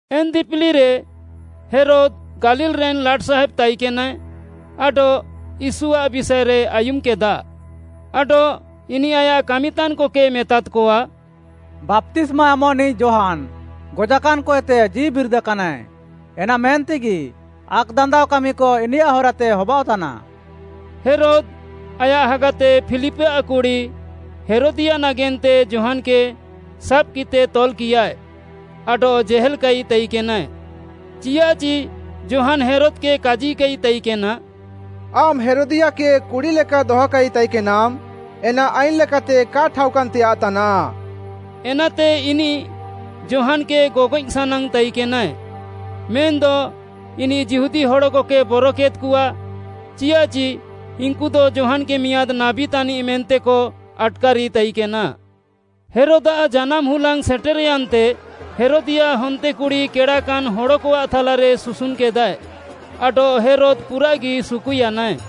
ଏନ୍‌ ଦିପିଲିରେ ହେରୋଦ୍‌ ଗାଲିଲ୍‌ରେନ୍‌ ଲାଟ୍‌ସାହେବ୍‌ ତାଇକେନାଏ ଆଡଃ ୟୀଶୁଆଃ ବିଷାଏରେ ଆୟୁମ୍‌କେଦା। ଆଡଃ ଇନିଃ ଆୟାଃ କାମିତାନ୍‌କକେ ମେତାଦ୍‌କଆ, “ବାପ୍ତିସ୍ମା ଏମଃନିଃ ଯୋହାନ୍‌ ଗଜାକାନ୍‌ଏତେ ଜୀଉବିରିଦାକାନାଏ, ଏନା ମେନ୍ତେଗି ଆକ୍‌ଦାନ୍ଦାଅ କାମିକ ଇନିୟାଃ ହରାତେ ହବାଅଃତାନା।” ହେରୋଦ୍‌ ଆୟାଃ ହାଗାତେ ଫିଲିପ୍‌ଆଃ କୁଡ଼ି ହେରୋଦିୟା ନାଗେନ୍ତେ ଯୋହାନ୍‌କେ ସାବ୍‌କିତେ ତଲ୍‌କିୟାଏ ଆଡଃ ଜେହେଲ୍‌କାଇ ତାଇକେନାଏ। ଚିୟାଃଚି ଯୋହାନ୍‌ ହେରୋଦ୍‌କେ କାଜିକାଇ ତାଇକେନା, “ଆମ୍‌ ହେରୋଦିୟାକେ କୁଡ଼ି ଲେକା ଦହକାଇ ତାଇକେନାମ୍‌ ଏନା ଆଇନ୍‌ ଲେକାତେ କା ଠାଉକାନ୍‌ତେୟାଃ ତାନାଃ।” ଏନାତେ ଇନିଃ ଯୋହାନ୍‌କେ ଗଗଏଃ ସାନାଙ୍ଗ୍‌ ତାଇକେନାଏ, ମେନ୍‌ଦ ଇନିଃ ଯିହୁଦୀ ହଡ଼କକେ ବରକେଦ୍‌କଆ, ଚିୟାଃଚି ଇନ୍‌କୁଦ ଯୋହାନ୍‌କେ ମିଆଁଦ୍‌ ନାବୀ ତାନିଃ ମେନ୍ତେକ ଆଟ୍‌କାରି ତାଇକେନା। ହେରୋଦ୍‌ଆଃ ଜାନାମ୍‌ ହୁଲାଙ୍ଗ୍‌ ସେଟେର୍‌ୟାନ୍‌ରେ, ହେରୋଦିୟାଃ ହନ୍ତେକୁଡ଼ି କେଡ଼ାକାନ୍‌ ହଡ଼କଆଃ ଥାଲାରେ ସୁସୁନ୍‌କେଦାଏ ଆଡଃ ହେରୋଦ୍‌ ପୁରାଃଗି ସୁକୁୟାନାଏ।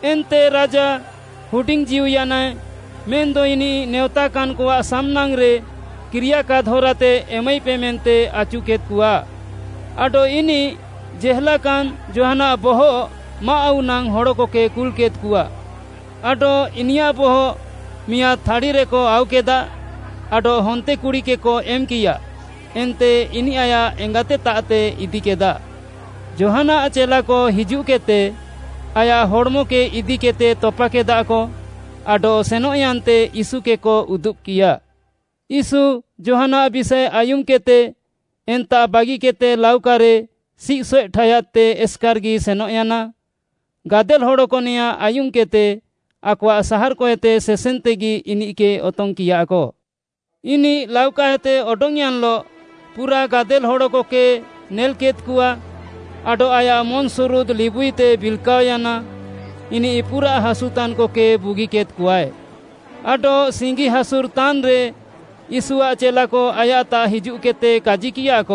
ଏନ୍ତେ ରାଜା ହୁଡିଙ୍ଗ୍‌ଜୀଉୟାନାଏ ମେନ୍‌ଦ ଇନିଃ ନେଅଁତାକାନ୍‌କଆଃ ସାମ୍‌ନାଙ୍ଗ୍‌ରେ କିରିୟାକାଦ୍‌ ହରାତେ ଏମାଇପେ ମେନ୍ତେ ଆଚୁକେଦ୍‌କଆ। ଆଡଃ ଇନିଃ ଜେହେଲାକାନ୍‌ ଯୋହାନ୍‌ଆଃ ବହଃ ମାଆଃ ଆଉ ନାଙ୍ଗ୍‌ ହଡ଼କକେ କୁଲ୍‌କେଦ୍‌କଆ। ଆଡଃ ଇନିୟାଃ ବହଃ ମିଆଁଦ୍‌ ଥାଡ଼ିରେକ ଆଉକେଦା ଆଡଃ ହନ୍ତେକୁଡ଼ିକେକ ଏମ୍‌କିୟା ଏନ୍ତେ ଇନିଃ ଆୟାଃ ଏଙ୍ଗାତେତାଃତେ ଇଦିକେଦା। ଯୋହାନ୍‌ଆଃ ଚେଲାକ ହିଜୁଃକେଦ୍‌ତେ ଆୟାଃ ହଡ଼୍‌ମକେ ଇଦିକେଦ୍‌ତେ ତପାକେଦାକ ଆଡଃ ସେନଃୟାନ୍ତେ ୟୀଶୁକେକ ଉଦୁବ୍‌କିୟା। ୟୀଶୁ ଯୋହାନ୍‌ଆଃ ବିଷାଏ ଆୟୁମ୍‌କେଦ୍‌ତେ ଏନ୍ତାଃ ବାଗିକେଦ୍‌ତେ ଲାଉକାରେ ସିଃସଏଃ ଠାୟାଦ୍‌ତେ ଏସ୍‌କାର୍‌ଗି ସେନଃୟାନା। ଗାଦେଲ୍‌ ହଡ଼କ ନେଆଁଁ ଆୟୁମ୍‌କେଦ୍‌ତେ ଆକଆଃ ସାହାର୍‌କଏତେ ସେସେନ୍‌ତେଗି ଇନିଃକେ ଅତଙ୍ଗ୍‌କିୟାକ। ଇନିଃ ଲାଉକାଏତେ ଅଡଙ୍ଗ୍‌ୟାନ୍‌ଲଃ ପୁରାଃ ଗାଦେଲ୍‌ ହଡ଼କକେ ନେଲ୍‌କେଦ୍‌କଆ ଆଡଃ ଆୟାଃ ମନ୍‌ସୁରୁଦ୍‌ ଲିବୁଇତେ ବିଲ୍‌କାଅୟାନା। ଇନିଃ ପୁରାଃ ହାସୁତାନ୍‌କକେ ବୁଗିକେଦ୍‌କଆଏ। ଆଡଃ ସିଙ୍ଗି ହାସୁରଃତାନ୍‌ରେ, ୟୀଶୁଆଃ ଚେଲାକ ଆୟାଃତାଃ ହିଜୁଃକେଦ୍‌ତେ କାଜିକିୟାକ,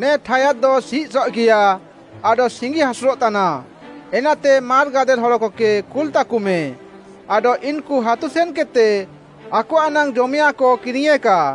“ନେ ଠାୟାଦ୍‍ଦ ସିଃସଏଃଗିୟା ଆଡଃ ସିଙ୍ଗି ହାସୁରଃତାନା, ଏନାତେ ମାର୍‌ ଗାଦେଲ୍‌ ହଡ଼କକେ କୁଲ୍‌ତାକମେ, ଆଡଃ ଇନ୍‌କୁ ହାତୁ ସେନ୍‌କେଦ୍‌ତେ ଆକଆଃ ନାଙ୍ଗ୍‌ ଜମେୟାଃଁକ କିରିଙ୍ଗ୍‌ୟେଁକା।”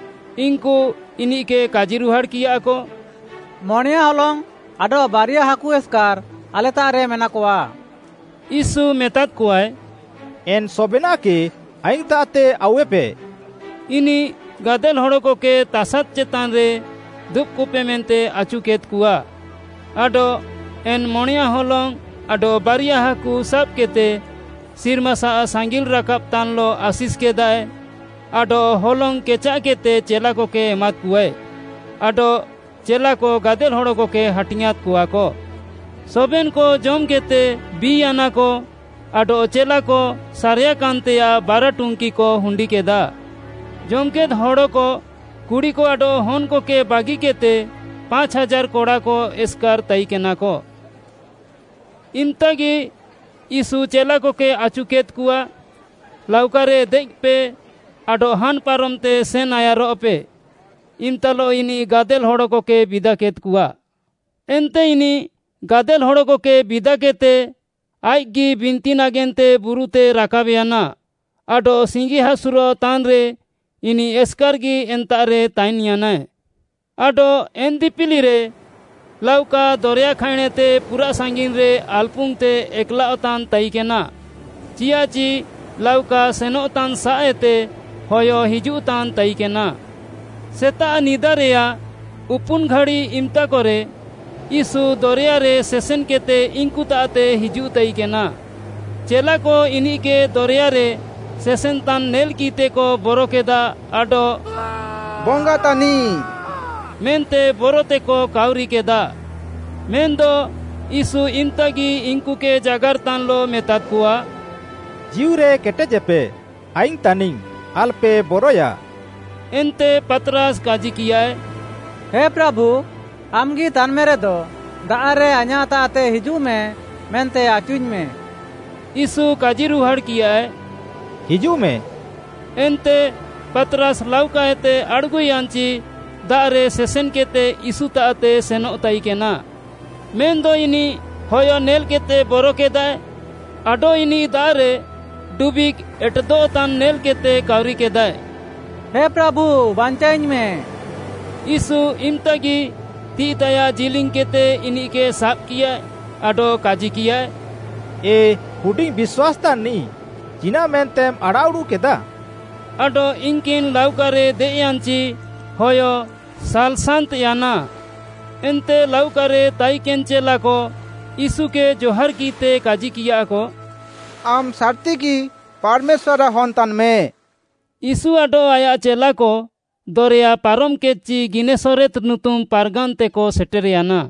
ଇନ୍‌କୁ ଇନିଃକେ କାଜିରୁହାଡ଼୍‌କିୟାକ, “ମଣେୟାଁ ହଲଙ୍ଗ୍‌ ଆଡଃ ବାରିଆ ହାକୁ ଏସ୍‌କାର୍‌ ଆଲେତାଃରେ ମେନାକଆ।” ୟୀଶୁ ମେତାଦ୍‌କଆଏ, “ଏନ୍‌ ସବେନାଃକେ ଆଇଙ୍ଗ୍‌ତାଃତେ ଆଉୱେପେ।” ଇନିଃ ଗାଦେଲ୍‌ ହଡ଼କକେ ତାସାଦ୍‌ ଚେତାନ୍‌ରେ ଦୁବ୍‌କପେ ମେନ୍ତେ ଆଚୁକେଦ୍‌କଆ, ଆଡଃ ଏନ୍‌ ମଣେୟାଁ ହଲଙ୍ଗ୍‌ ଆଡଃ ବାରିଆ ହାକୁ ସାବ୍‌କେଦ୍‌ତେ ସିର୍ମାସାଃ ସାଙ୍ଗିଲ୍‌ରାକାବ୍‌ତାନ୍‌ଲଃ ଆଶିଷ୍‌କେଦାଏ ଆଡଃ ହଲଙ୍ଗ୍‌ କେଚାଃକେଦ୍‍ତେ ଚେଲାକକେ ଏମାଦ୍‍କଆଏ, ଆଡଃ ଚେଲାକ ଗାଦେଲ୍‌ ହଡ଼କକେ ହାଟିଙ୍ଗ୍‌ଆଁଁଦ୍‌କଆକ। ସବେନ୍‌କ ଜମ୍‌କେଦ୍‌ତେ ବି'ୟାନାକ ଆଡଃ ଚେଲାକ ସାରେୟାକାନ୍‌ତେୟାଃ ବାରା ଟୁଙ୍କିକ ହୁଣ୍ଡିକେଦା। ଜମ୍‌କେଦ୍‌ ହଡ଼କ, କୁଡ଼ିକ ଆଡଃ ହନ୍‌କକେ ବାଗିକେଦ୍‌ତେ ପାଞ୍ଚ୍‌ ହାଜାର୍‌ କଡ଼ାକ ଏସ୍‌କାର୍‌ ତାଇକେନାକ। ଇମ୍‌ତାଗି ୟୀଶୁ ଚେଲାକକେ ଆଚୁକେଦ୍‌କଆ, ଲାଉକାରେ ଦେଏଃପେ ଆଡଃ ହାନ୍‌ ପାରମ୍‌ତେ ସେନ୍‌ ଆୟାରଃପେ, ଇମ୍‌ତାଲଃ ଇନିଃ ଗାଦେଲ୍‌ ହଡ଼କକେ ବିଦାକେଦ୍‌କଆ। ଏନ୍ତେ ଇନିଃ ଗାଦେଲ୍‌ ହଡ଼କକେ ବିଦାକେଦ୍‌ତେ, ଆଇଃକ୍‌ଗି ବିନ୍ତି ନାଗେନ୍ତେ ବୁରୁତେ ରାକାବ୍‍ୟାନା ଆଡଃ ସିଙ୍ଗିହାସୁର୍‌ତାନ୍‌ରେ ଇନିଃ ଏସ୍‌କାର୍‌ଗି ଏନ୍ତାଃରେ ତାଇନ୍‌ୟାନାଏ। ଆଡଃ ଏନ୍‌ ଦିପିଲିରେ ଲାଉକା ଦରେୟା ଖାଇଁଣ୍‌ଏତେ ପୁରାଃ ସାଙ୍ଗିନ୍‌ରେ ଆଲ୍‌ପୁଙ୍ଗ୍‌ତେ ଏକ୍‌ଲାଅଃତାନ୍‌ ତାଇକେନା, ଚିୟାଃଚି ଲାଉକା ସେନଃତାନ୍‌ସାଃଏତେ ହୟ ହିଜୁଃତାନ୍‌ ତାଇକେନା। ସେତାଃ ନିଦାରେୟାଃ ଉପୁନ୍‌ ଘାଡ଼ି ଇମ୍‌ତାକରେ ୟୀଶୁ ଦରେୟାରେ ସେସେନ୍‌କେଦ୍‌ତେ ଇନ୍‌କୁତାଃତେ ହିଜୁଃତାଇକେନା। ଚେଲାକ ଇନିଃକେ ଦରେୟାରେ ସେସେନ୍‌ତାନ୍‌ ନେଲ୍‌କିଃତେକ ବରକେଦା ଆଡଃ “ବଙ୍ଗା ତାନିଃ” ମେନ୍ତେ ବରତେକ କାଉରିକେଦାଃ। ମେନ୍‌ଦ ୟୀଶୁ ଇମ୍‌ତାଗି ଇନ୍‌କୁକେ ଜାଗାର୍‌ତାନ୍‌ଲଃ ମେତାଦ୍‌କଆ, “ଜୀଉରେ କେଟେଜେପେ, ଆଇଙ୍ଗ୍‌ ତାନିଙ୍ଗ୍‌ ଆଲ୍‌ପେ ବରଏୟା।” ଏନ୍ତେ ପାତ୍‌ରାସ୍‌ କାଜିକିୟାଏ, “ହେ ପ୍ରାଭୁ, ଆମ୍‌ଗି ତାନ୍‌ମେରେଦ ଦାଆଃରେ ଆଇଁୟାଃତାଃତେ ହିଜୁଃମେ ମେନ୍ତେ ଆଚୁଇଙ୍ଗ୍‌ମେ।” ୟୀଶୁ କାଜିରୁହାଡ଼୍‌କିୟାଏ, “ହିଜୁଃମେ।” ଏନ୍ତେ ପାତ୍‌ରାସ୍‌ ଲାଉକାଏତେ ଆଡ଼୍‌ଗୁୟାନ୍‌ଚି ଦାଆଃରେ ସେସେନ୍‌କେଦ୍‌ତେ ୟୀଶୁତାଃତେ ସେନଃ ତାଇକେନା। ମେନ୍‌ଦ ଇନିଃ ହୟ ନେଲ୍‌କେଦ୍‌ତେ ବରକେଦାଏ ଆଡଃ ଇନିଃ ଦାଆଃରେ ଡୁବିଃଗ୍‌ ଏଟେଦଃତାନ୍‌ ନେଲ୍‌କେଦ୍‌ତେ କାଉରିକେଦାଏ, “ହେ ପ୍ରାଭୁ, ବାଞ୍ଚାଅଇଙ୍ଗ୍‌ମେଁ।” ୟୀଶୁ ଇମ୍‌ତାଗି ତିଃଇତାୟାଃ ଜିଲିଙ୍ଗ୍‌କେଦ୍‍ତେ ଇନିଃକେ ସାବ୍‍କିୟାଏ ଆଡଃ କାଜିକିୟାଏ, “ଏ ହୁଡିଙ୍ଗ୍‌ ବିଶ୍ୱାସ୍‌ତାନ୍‌ନିଃ ଚିନାଃମେନ୍ତେମ୍‌ ଆଡ଼ାଃଉଡ଼ୁଃକେଦା?” ଆଡଃ ଇନ୍‌କିନ୍‌ ଲାଉକାରେ ଦେଏଃୟାନ୍‌ଚି ହୟ ସାଲ୍‌ସାନ୍ତ୍‌ୟାନା। ଏନ୍ତେ ଲାଉକାରେ ତାଇକେନ୍‌ ଚେଲାକ ୟୀଶୁକେ ଜହାର୍‌କିଃତେ କାଜିକିୟାକ, “ଆମ୍‌ ସାର୍‌ତିଗି ପାର୍‌ମେଶ୍ୱାର୍‌ଆଃ ହନ୍‌ ତାନ୍‌ମେ।” ୟୀଶୁ ଆଡଃ ଆୟାଃ ଚେଲାକ ଦରେୟା ପାରମ୍‌କେଦ୍‌ଚି ଗିନେସରେତ୍‌ ନୁତୁମ୍‌ ପାର୍‌ଗାନ୍‌ତେକ ସେଟେର୍‌ୟାନା।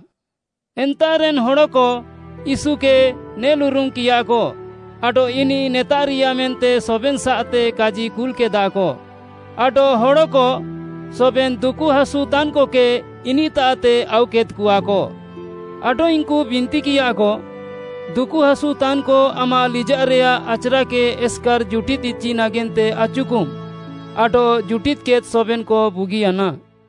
ଏନ୍ତାଃରେନ୍‌ ହଡ଼କ ୟୀଶୁକେ ନେଲ୍ଉରୁମ୍‌କିୟାକ। ଆଡଃ ଇନିଃ ନେତାଃରିୟା ମେନ୍ତେ ସବେନ୍‌ସାଃତେ କାଜିକୁଲ୍‌କେଦାକ ଆଡଃ ହଡ଼କ ସବେନ୍‌ ଦୁକୁହାସୁତାନ୍‌କକେ ଇନିଃତାଃତେ ଆଉକେଦ୍‌କଆକ। ଆଡଃ ଇନ୍‌କୁ ବିନ୍ତିକିୟାକ, ଦୁକୁହାସୁତାନ୍‌କ ଆମାଃ ଲିଜାଃରେୟାଃ ଆଚ୍‌ରାକେ ଏସ୍‌କାର୍‌ ଜୁଟିଦ୍‌ ଇଚି ନାଗେନ୍ତେ ଆଚୁକମ୍‌ ଆଡଃ ଜୁଟିଦ୍‌କେଦ୍‍ ସବେନ୍‌କ ବୁଗିୟାନା।